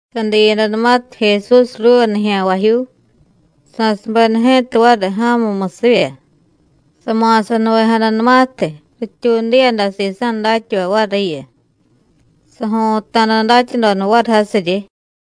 Sadiyadanumatiy Jesús ruuva nijya̱nvajyuu, sa̱subeda ji̱ta variy ja̱mumusivya. Sama̱sanuvejadanumatiy, rityuudiyada sisa̱ datyavay variyu. Sajo̱ta̱da datyadoda variy jasiryi.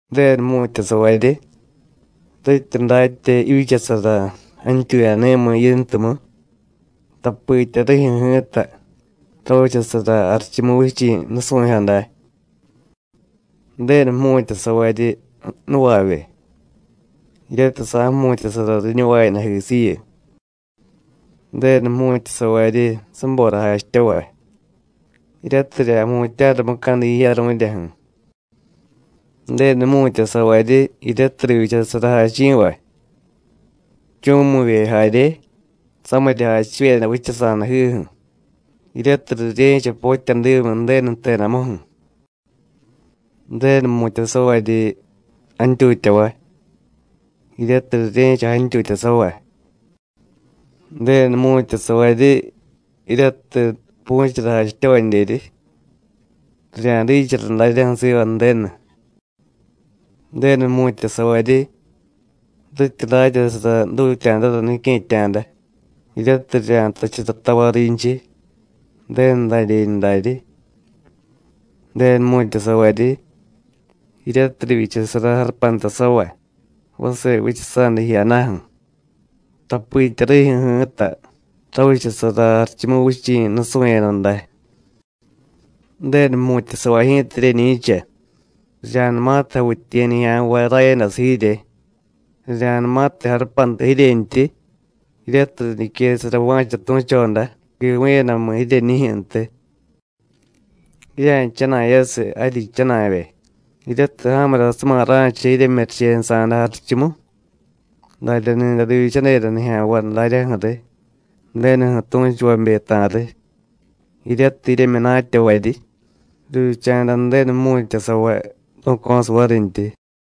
“Ju̱denu jmu̱tyasavaryi rityi datya jivyichasara jantyuyani̱miy yintumu, tapitya rijyu̱ ji̱ta ravichasara Jarichumuvichi̱ nusu̱jyo day. Ju̱denu jmu̱tyasavaryi nuvavye, jiryatiy sa̱jmu̱tyasara riñuvayadajisiyu. Ju̱denu jmu̱tyasavaryi sabora jachityavay, jiryatiy rirya̱jmutya̱ra mucadi jiyaru̱ryaju̱. Ju̱denu jmu̱tyasavaryi jiryatiy rivyichasara jachi̱vay, jchu̱mu̱vye jarye, samirya jachivyeda vichasa̱dajiju̱, jiryatiy rirye̱cha potyadimyi Ju̱denu jtedamuju̱. Ju̱denu jmu̱tyasavaryi jantyutyavay, jiryatiy rirye̱cha jantyutyasavay. Ju̱denu jmu̱tyasavaryi jiryatiy pu̱chara jachityavadyeryi, rirya̱dichara daryaju̱ siva Ju̱denu. Ju̱denu jmu̱tyasavaryi rityi datyasara jdutya̱dara nique̱tya̱da, jiryatiy rirya̱jtachara tavay rinchiy: Ju̱denu dadyeñu daryi. Ju̱denu jmu̱tyasavaryi jiryatiy rivyichasara jarupantasavay vase vichasa̱da jiyadaju̱, tapitya rijyu̱ ji̱ta ravichasara Jarichumuvichi̱ nusu̱yada day. Ju̱denu jmu̱tyasavay ji̱ta jiryeñi̱cha rirya̱numatiy javityiye̱ nijya̱nvay rayadasiy jirye, rirya̱numatiy jarupanta jiryentyi, jiryatiy riñiquesara va̱cha tu̱choda quivu̱yadamu jiryeñijyu̱ntiy. Jirya̱jchana̱yasiy jaryi jchana̱vye, jiryatiy ja̱murasuma ra̱cha jiryemyurichenusa̱da jarichumu. Darya ni̱day rivyichadeda nijya̱nvay daryaju̱riy Ju̱denuju̱ tu̱chuvabe ta̱riy, jiryatiy jiryemyunatyavaryi, rivyicha̱da Ju̱denu jmu̱tyasavay ru̱co̱siy varintyi.”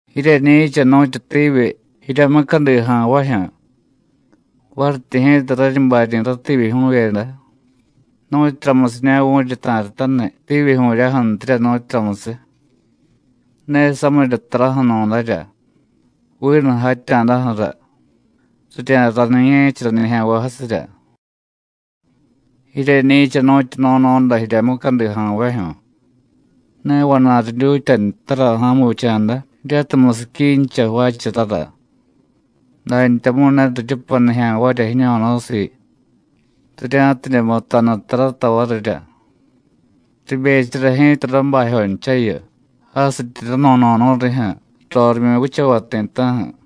“Jiryeñi̱cha nu̱tyu tivyi jirya mucadi ja̱nvajyu̱; varityi ji̱ta raryi baryi̱ rativyijyu̱vyeda, ¿nu̱tyuramusiña̱ vu̱ryi ta̱ryataniy tivyijyu̱ryaju̱ntirya, nu̱tyuramusiy? Ne samirya taraju̱nu̱darya, vinu jatya̱daju̱ra, rirya̱raniye̱chara nijya̱nvay jasirya. Jiryeñi̱cha nu̱tyu no̱no̱da jirya mucadija̱nvajyu̱. Ne vana̱y ridyutya ntara ja̱mu vicha̱da jiryatiy musiquincha jvaacharara. Dantyamu̱y ne riryupay nijya̱nvarya jiño̱no̱siiy rirya̱tidye mutanu tarata varirya. Ribechara ji̱ta rabajyonchayu, jasityi rano̱no̱nu̱y rijyu̱ rorimyu vichavay ti̱ta̱ju̱.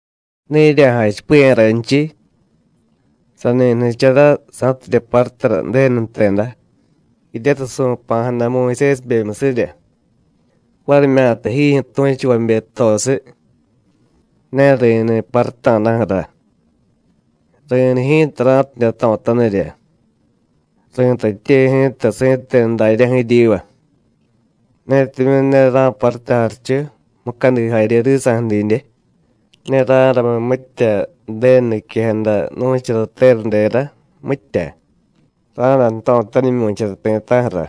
“Ne jirya̱jachipiya̱ raynchiy: Sani jnichara sa̱tidye parutara Ju̱denu jteda, jiryatiy su̱pa̱jada Muyusésibemyusirya, varimyata jijyu̱ tu̱chuvabe jtosiy. Ne ri̱niy paruta̱daju̱ra, ri̱niy ji̱ta ra̱tidye jto̱tanirya. Ri̱tatye ji̱ta si̱tenu daryaju̱ jiryiva: Netimyu̱ ne ra̱parutay jarichu, mucadi jarye risa̱ju̱ didye, ne ra̱ramiy mitya Ju̱denu niquejada nu̱chara teradera, mitya, ra̱day jto̱tanimyu̱chara ti̱ta̱ju̱ra.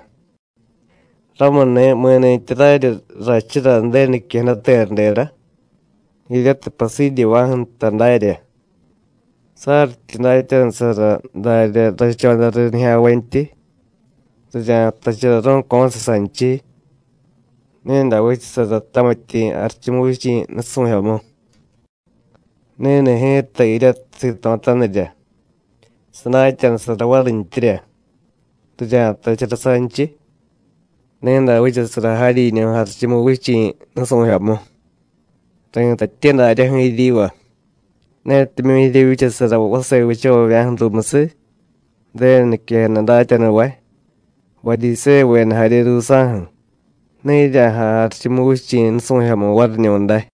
Ramuni̱ mi̱ni̱tyi raryi rrachura Ju̱denu niquejada teradera jiryatiy pasidyeva̱ju̱ nta darya, saryityi datyanusara darya rrachodariy nijya̱nvantyi, rirya̱jtachara ru̱co̱siy sanchiy: Ni̱day vichasara tamityi̱ Jarichumuvichi̱ nusu̱jyomu. Ni̱ni̱ ji̱ta jiryatiy sito̱tanirya, sadatyanusara varintyirya, rirya̱jtachara sanchiy: Ni̱day vichasara jaryiñu̱ Jarichumuvichi̱ nusu̱jyomu. Ri̱tatye daryaju̱ jiryiva: Netimyu̱ jiryevyichasara vase vichavavya̱ju̱ ruumusiy Ju̱denu niquejada datyanuvay, Varyisévuveda jarye ruusa̱ju̱, ne jirya̱jay Jarichumuvichi̱ nusu̱jyomu variñu̱day.”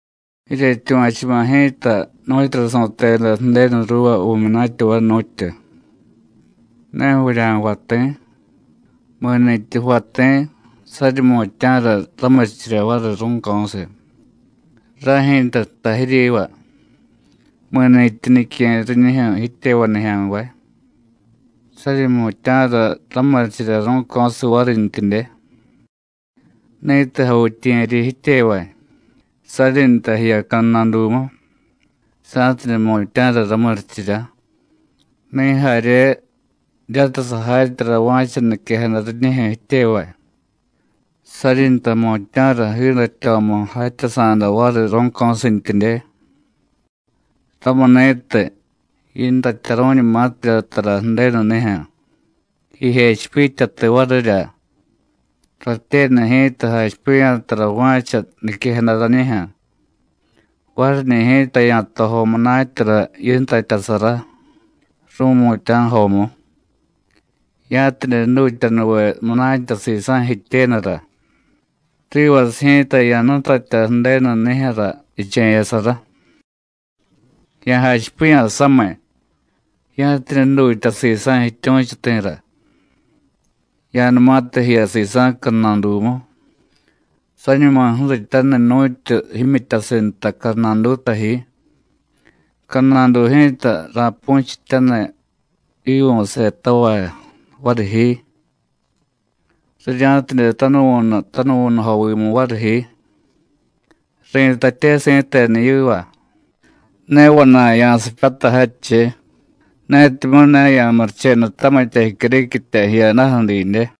“Jiryetyuva̱chuma̱ ji̱ta nu̱tyura su̱teda Ju̱denu ruuva vu̱myunatyavay, nu̱tyu: Ne vurya̱jvay ti̱. Mi̱ni̱tyi jvay ti̱, saryi jmutya̱ra ramurichirya variy ru̱co̱siy. Ray ji̱ta jtay jiryiva: Mi̱ni̱tyi nique̱y riñijyu̱ jityevay nijya̱nvay, saryi jmutya̱ra ramurichirya ru̱co̱siy varintyidye. Ni̱tiy javityiye̱ryi jityevay, saryi nta jiya cadnadumu, sa̱tidye jmutya̱ra ramurichirya; ni̱ jarye jiryatiy sajatyara va̱cha niquejada riñijyu̱ jityevay, saryi nta jmutya̱ra jiidatyo̱mu jatyasa̱da variy ru̱co̱sintyidye. Ramuni̱tiy, yintatyaru̱ñumatirya tara Ju̱denunijyu̱, jijechipityatiy varirya: Ratyenu ji̱ta jachipiya̱ tara va̱cha niquejada rañijyu̱, variñi̱ ji̱ta ya̱tojo munatyara yintatyasara, ru̱mutya̱jomu, ya̱tidye jdutyanuve munatya sisa̱ jityenura, rivasiy ji̱ta ya̱jnutatya Ju̱denu nijyu̱ra jiche̱yasara. Ya̱jachipiya̱ samiy, ya̱tidye jdutya sisa̱ jityu̱chuti̱rá, ya̱numatiy jiya sisa̱ cadnadumu, sañuma ju̱rityaniy nu̱tyu jimyityasiy nta cadnaduta ji, cadnadu ji̱ta ra̱pu̱chityaniy jiivu̱setavay variy ji, rirya̱tidye tanuvu̱nu tanuvu̱nujovimu variy ji. Ri̱tatye si̱tenu yiva: Ne vana̱y ya̱sipyatay jadchiy netimyu̱ ne ya̱murichenu tamitya jicyuriquitya jiyadaju̱ didye.”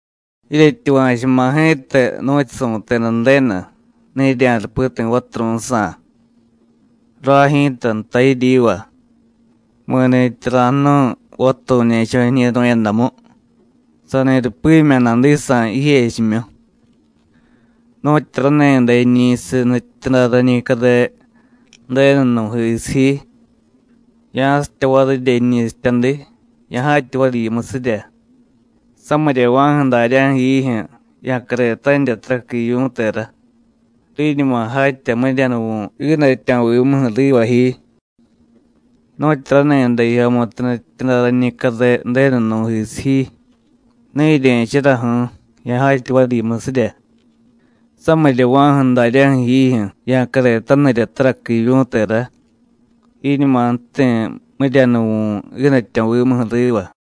“Jiryetyuva̱chuma̱ ji̱ta nu̱tyu su̱teda Ju̱denu: Ne jirya̱rupi ti̱ vaturu̱jsa̱. Ray ji̱ta jtay jiryiva: Mi̱ni̱tyi ra̱jnu̱y vaturu̱ñe̱cho̱ jiñi̱ru̱yadamu, sani rupimya̱ nadisa̱ jijechimyu. Nu̱tyi rani̱day jiñi̱siy nutyityuday rañi care Ju̱denu nú̱jisiy ji, ya̱sitya varirya jiñi̱sityadi, ya̱jatya variy yimusirya. Samiryava̱ju̱ daryaju̱ jiijyu̱ ya̱caretanirya taraqui jivyu̱tera, riñuma jatya miryanuvu̱ jiidatyo̱vimuju̱ riva ji. Nu̱tyi rani̱day jijyomutu nutyityuday rañi care Ju̱denu nú̱jisiy ji, ne jirye̱charaju̱u̱, ya̱jatya variy yimusirya; samiryava̱ju̱ daryaju̱ jiijyu̱ ya̱caretanirya taraqui jivyu̱tera, jiiñuma jti̱ miryanuvu̱ jiidatyo̱vimuju̱ riva.”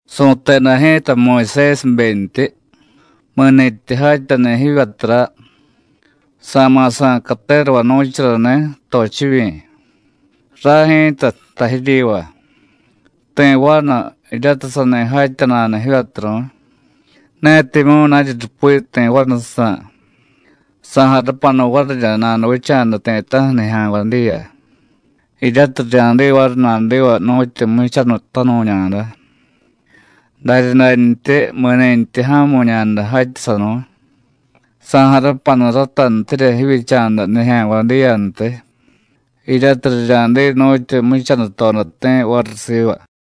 “Su̱teda ji̱ta Muyusésibentyi: Mi̱ni̱tyi jatyani̱ jivyatura, sa̱ma̱ sa̱y caterava nu̱charani̱, tochivyi̱. Ray ji̱ta jtay jiryiva: Ti̱ vanu jiryatiy sani jatya nada jivyaturu̱y, netimyu̱ naryi rupi ti̱ vanujsa̱, sa̱jarupanu varirya nanuvicha̱da ti̱ta̱ju̱ nijya̱nvay diya, jiryatiy rirya̱diy variy nadiva nu̱tyu jmuchanutanu̱ñada. Daryadantyi mi̱nintyi ja̱mu̱ñada jatyasanu̱y, sa̱jarupanu ratantirya jivyicha̱da nijya̱nvay diyantiy jiryatiy rirya̱diy nu̱tyu jmuchanutodati̱ variy siva.”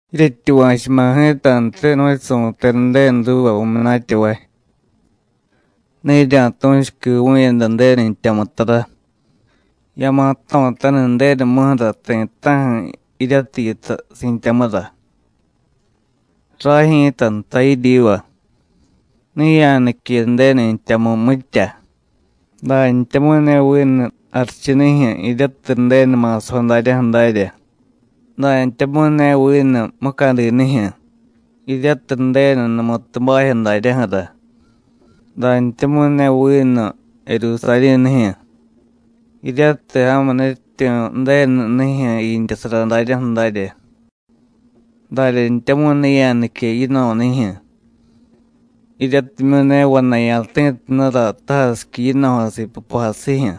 “Jiryetyuva̱chuma̱ ji̱tantiy nu̱tyu su̱teda Ju̱denu ruuva vu̱myunatyavay: Ne jirya̱tu̱chu quivu̱yada Ju̱denu jtyamu tara; ya̱ma̱ jto̱taniy Ju̱denumuju̱ra ti̱ta̱ju̱ jiryatiy yitay si̱tyamura. Ray ji̱ta jtay jiryiva: Ne ya̱nique Ju̱denu jtyamu mitya, dantyamu̱y ne vinu jarichunijyu̱ jiryatiy Ju̱denu ma̱sajo daryaju̱ darya, dantyamu̱y ne vinu mucadinijyu̱ jiryatiy Ju̱denu numutu bajyo daryaju̱ra, dantyamu̱y ne vinu Jerusarí̱nijyu̱, jiryatiy ja̱mu nutyityu̱ Ju̱denu nijyu̱ jiintyasara daryaju̱ darya. Daryantyamu̱y ne ya̱nique yino̱nijyu̱, jiryatimyu̱ ne vana̱y ya̱ti̱tunura tajasiqui yino̱jasiy pupajasijyu̱,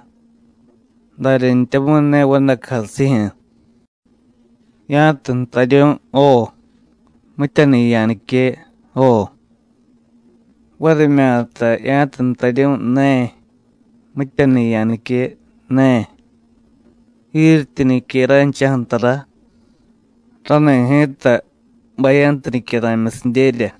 daryantyamu̱y ne vadacujasijyu̱. Ya̱tiy jtaryu̱y: Jo, mityani̱ ya̱nique: Jo, varimyata ya̱tiy jtaryu̱y Ne, mityani̱ ya̱nique: Ne. Jiryetyi nique ranchaju̱ tara, rani̱ ji̱ta bayantu nicyara̱myusidyerya.”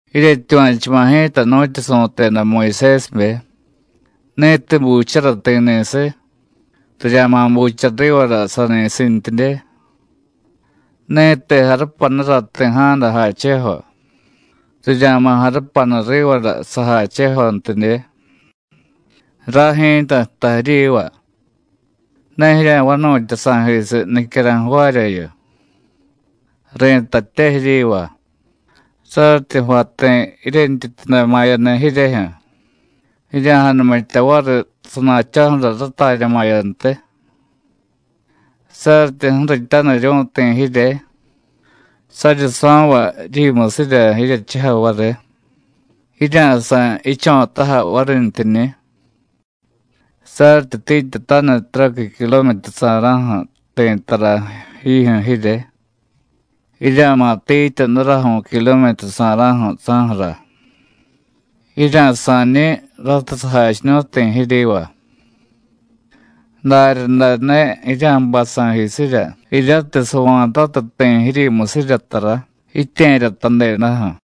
“Jiryetyuva̱chuma̱ ji̱ta nu̱tyu su̱teda Muyusésibe: Ni̱tiy buchara ti̱ ni̱siy, rirya̱ma̱ bucha rivara sani̱sintyidye; ni̱tiy jarupanura ti̱ ja̱da jachejo, rirya̱ma̱ jarupanu rivara sajachejontidye. Ray ji̱ta jtay jiryiva: Ne jirya̱vanu̱tya sa̱jisiy nicyara̱y jvaaryayu. Ri̱tatye jiryiva: Saryityi jvay ti̱ jiryentyityuday ma̱yaniy jiryejyu̱, jirya̱janumitya variy sana̱cho̱ju̱ra ratarya ma̱yantiy. Saryityi ju̱rityaniryu̱y ti̱ jirye, saryi so̱vay jiryimusirya jiryechujay variy, jirya̱sa̱y jicho̱tájay varintyiñi̱. Saryityi tiityataniy taraqui kilometrusa̱ra̱ju̱ ti̱ tara jijyu̱ jirye, jirya̱ma̱ tiitya daraju̱y kilometrusa̱ra̱ju̱ saju̱ra. Jirya̱sa̱ñi̱ ratiy sajachiñu̱y ti̱ jiryiva; daryaday ne jirya̱jbay sa̱jisirya jiryatiy sava̱tatiy ti̱ jiryimusirya tara jitye̱ryatadedaju̱.”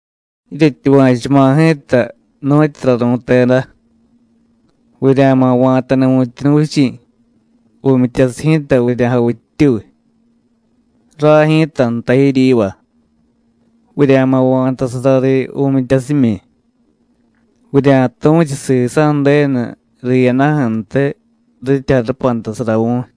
“Jiryetyuva̱chuma̱ ji̱ta nu̱tyura ru̱teda: Vurya̱ma̱ va̱tani̱ vu̱tyuunuvichi̱, vu̱myityasiy ji̱ta vurya̱javittyuy. Ray ji̱ta jtay jiryiva: Vurya̱ma̱ va̱tasara riy vu̱myityasimyi; vurya̱tu̱chu sisa̱ Ju̱denu riyadaju̱ntiy rityi jarupantasara vu̱y.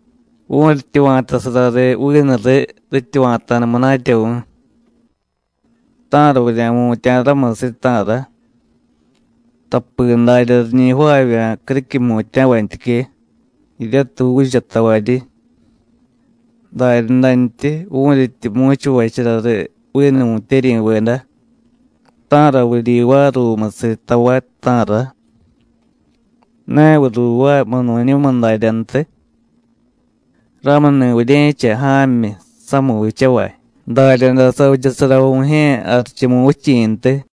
Vu̱ryityi va̱tasara riy, vinu riy, rityi va̱ta̱da munatya vu̱y, ¿ta̱ra vurya̱jmutya̱ ramusiy, ta̱ra? Tapi darya riñi jvaavya̱ criquiy jmutya̱vantyique, jiryatiy juuchatavaryi. Daryadantyi, vu̱ryityi mu̱chuvachara riy vinu vu̱tyeryi̱veda, ¿ta̱ra vuryivaay ruumusiy tavay, ta̱ra? ¿Ne viy ruuvaay munu̱ñumiy daryantiy? Ramuni̱ vurye̱cha ja̱myi samiy vichavay, daryaday savichasara Vu̱jye̱ Jarichumuvichi̱ntiy.”